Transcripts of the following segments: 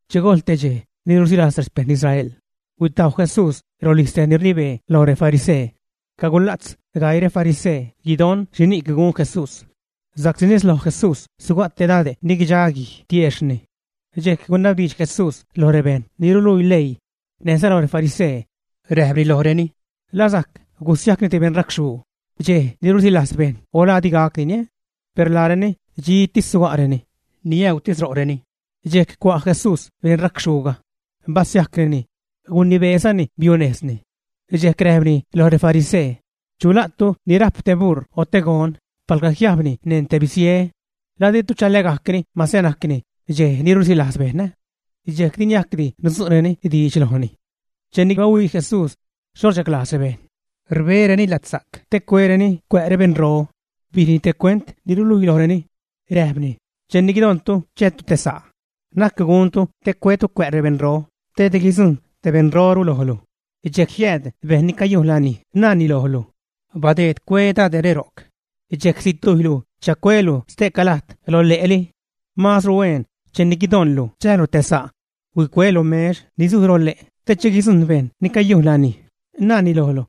Che gojl te dxej ni rusilajz rexpejṉ Israel, huitajw Jesús rolijz tej ni rnibee loj refarisee. Cagula'tz gaii refarisee, guidon xhini'c gun Jesús, sa'csi nez loj Jesús suga' te dade' ni guidxa guij tiejxhni. Dxejc gunabdiidx Jesús lo rebejṉ ni ruluii leii näjza lo refarisee, räjpni lojreni: ―¿La sajc gusiajcni te beṉracxhuu dxej ni rusilajz bejṉ o la di gacdini? Per laareni dxitis suga'reni, niäutis ro'reni. Dxejc cua' Jesús beṉracxhuuga, basiajcnini, gunibeezani biunejzni. Dxejc räjpni loj refarisee: ―Chu la'tu ni rajp te buṟ o te gon, palga jiajbni neṉ te bisie, ¿la ditu chalägajcni mase najcni dxej ni rusilajz bejṉ, ä? Dxejc di niajcni nudzu'reni diidx lojni. Cheni bahuii Jesús xho rchaglajz rebejṉ rbereni latsa'c te cuereni cuä' rebejṉro, bijni te cuent ni ruluii lojreni, räjpni: ―Cheni guidoṉtu chäätu te sa', na'c guntu te cuetu cuä' rebeṉro, te di guidzujṉ te beṉroru lojlu, dxejc jiääd bejṉ ni cayujn lanij, naani lojlu: “Badeed cue dade're ro'c.” Dxejc situjylilu chacuelu ste'ca lajt lo le'li. Maazru hueen, cheni guidoṉlu chäälu te sa', huicue lo mex ni zuj lo le' te che guidzujṉ bejṉ ni cayujn lanij, naani lojlu: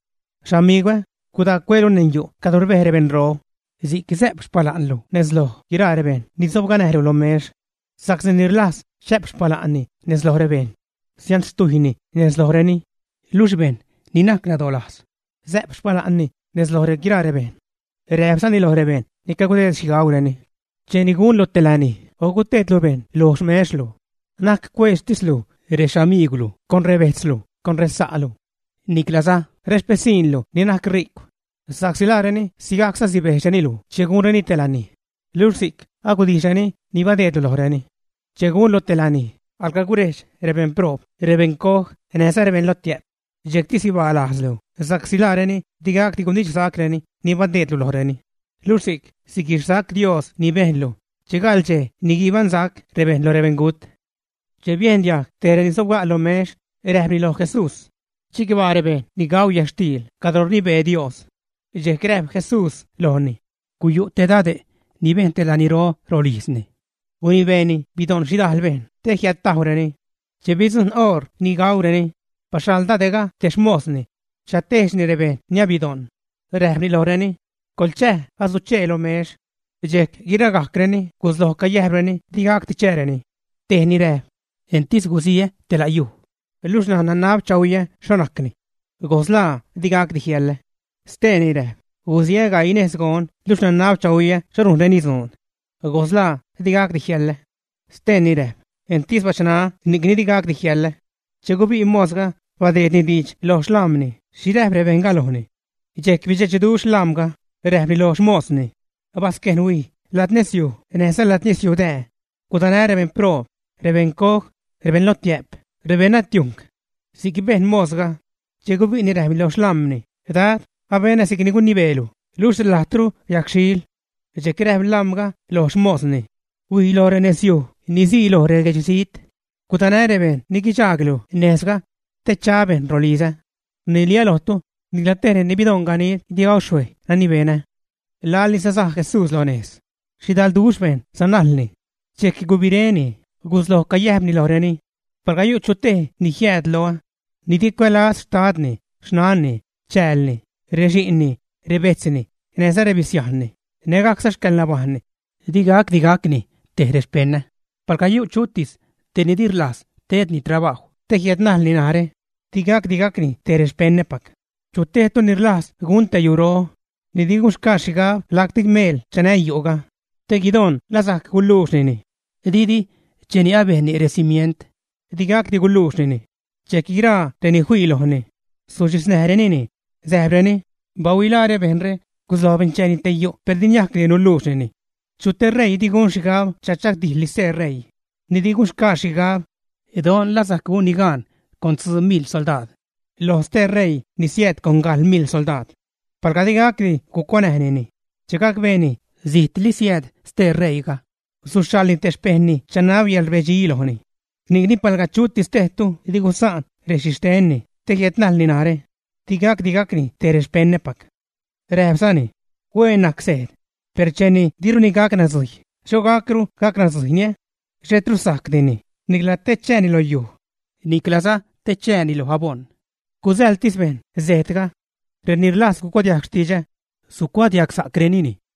“Xamigwä, gudaa cuelu neṉ yu' cadro rbej rebeṉro.” Si'c sä'p xpala'nlu nez loj guiraa rebejṉ ni sobganäjlu lo mex. Sa'csi ni rlajz chä'p xpala'nni nez loj rebejṉ, sianxtujyni nez lojreni. Luxh bejṉ ni najc nadolajz, sä'p xpala'nni nez loj guiraa rebejṉ. Räjpzani loj bejṉ ni cagudeed xhi gaureni: ―Cheni gunlu te lanij o guteedlu bejṉ lo xmexlu, na'c cueedxtislu rexamigwlu con rebejtzlu, con resa'lu, niclaza rexpisiṉlu ni najc ri'cw, sa'csi laareni sigajcza sibejdxreni luj che gunreni te lanij, luxh si'c agudijxreni ni badeedlu lojreni. Che gunlu te lanij, alga gurejdx rebeṉproob, rebeṉcoj, näjza rebeṉlotiä'p, dxejcti sibaa lajzlu sa'csi laareni di gacdi gunidxsacreni ni badeedlu lojreni; luxh si'c siguixsac Dios ni bejnlu che gaḻ dxej ni guibaṉsac rebejṉ loj rebeṉgut. Che biejn diajg tej reni sobga' lo mex, räjpni loj Jesús: ―Chicbaa rebejṉ ni gau yätxtiil cadro rnibee Dios. Dxejc räjp Jesús lojni: ―Guyu' te dade' ni bejn te laniro rolijzni. Gunibeeni bidoṉ xhidajl bejṉ te jiädtaunäjrenini. Che bidzujṉ oṟ ni gaureni, baxhaḻ dade'ga te xmosni chatejdxni rebejṉ ni abidoṉ, räjpni lojreni: “Coḻchäj, asuchee lo mex.” Dxejc guiragajcreni gusloj cayäjb di gacdi chääreni. Tejni räjp: “Entis gusiä te la' yuj, luxh ṉaj nanab chahuiä xho najcni. Goslaa di gacdi jiäḻä.” Steeni räjp: “Gusiä gaii nejs gon, luxh nanab chahuiä xho rujnreni dzuun. Goslaa di gacdi jiäḻä.” Steeni räjp: “Entis bachṉaä ni'cni di gacdi jiäḻä.” Che gubi' mosga, badeedni diidx lo xlam̲ni xhi räjp rebejṉga lojni. Dxejc bidxechduxh lam̲ga, räjpni lo xmosni: “Basquejn huij ladnezyuj näjza ladnezyuj dää, gudanä rebeṉproob, rebeṉcoj, rebeṉlotiä'p, rebeṉnatiujṉc.” Si'c bejn mosga. Che gubi'ni räjpni lo xlam̲ni: “Dad, abenä si'c ni gunibeelu, luxh lajtru yagxhiil.” Dxejc räjp lam̲ga lo xmosni: “Huij lo renezyuj ni sii loj reguedxzijt, gudanäj rebejṉ ni guidxaaglu nejzga, te cha bejṉ rolizä. Rniliä lojtu, nicla tej reni bidoṉ ganid di gau xhuej nani benä.” Laḻ sasaj Jesús lo nejz, xhidalduxh bejṉ sanajlni. Dxejc gubiréni, gusloj cayäjpni lojreni: ―Palga yu' chu tej ni jiääd loä, ni di cuälaz xtadni, xnanni, chäälni, rexi'nni, rebejtzni, näjza rebisiajnni, nägajcza xcäḻnabajṉni, di gacdi gacni te rexpeṉä. Palga yu' chutis tej ni di rlajz tedni trabajw te jiädnajlni narä, di gacdi gacni te rexpeṉäpac. Chu tejtu ni rlajz gun te yuro, ni di gunxgaa xhigab lacti meel chanä yu'ga, te guidon la sajc guluuxnini. Didi cheni abejnni recimient, di gacdi guluuxnini, dxejc guiraa reni fii lojni suxhiznäjrenini, säjpreni: “¡Bahuilaare! Bejṉre gusloj bencheeni te yu' per di niajcdi nuluuxnini.” ¿Chu te ṟeii ni gun xhigab chachagdijḻni stee ṟeii, ni di gunxgaa xhigab don laa sajc gunni gaan con tzuu miḻ soldaad loj stee ṟeii ni siääd con gajḻ miḻ soldaad, ä? Palga di gacdi gucuanäjnini, che gacbeeni zijtli siääd stee ṟeiiga, suxhaḻni te xpejṉni chanab yäḻrbedxi lojni. Ni'cni palga chutis tejtu di gusaan rexhixtenni te jiädnajlni narä, di gacdi gacni te rexpeṉäpac. Räjpzani: ―Huen najc sejd. Per cheni diruni gac nadzujy, ¿xho gacru gac nadzujyni? Xhetru sajcdini, nicla te chääni loj yuj, niclaza te chääni lo aboṉ. Gusäḻtis bejṉ sejdga. Reni rlajz gucuadiajg xtidxä, sucuadiagsa'creni.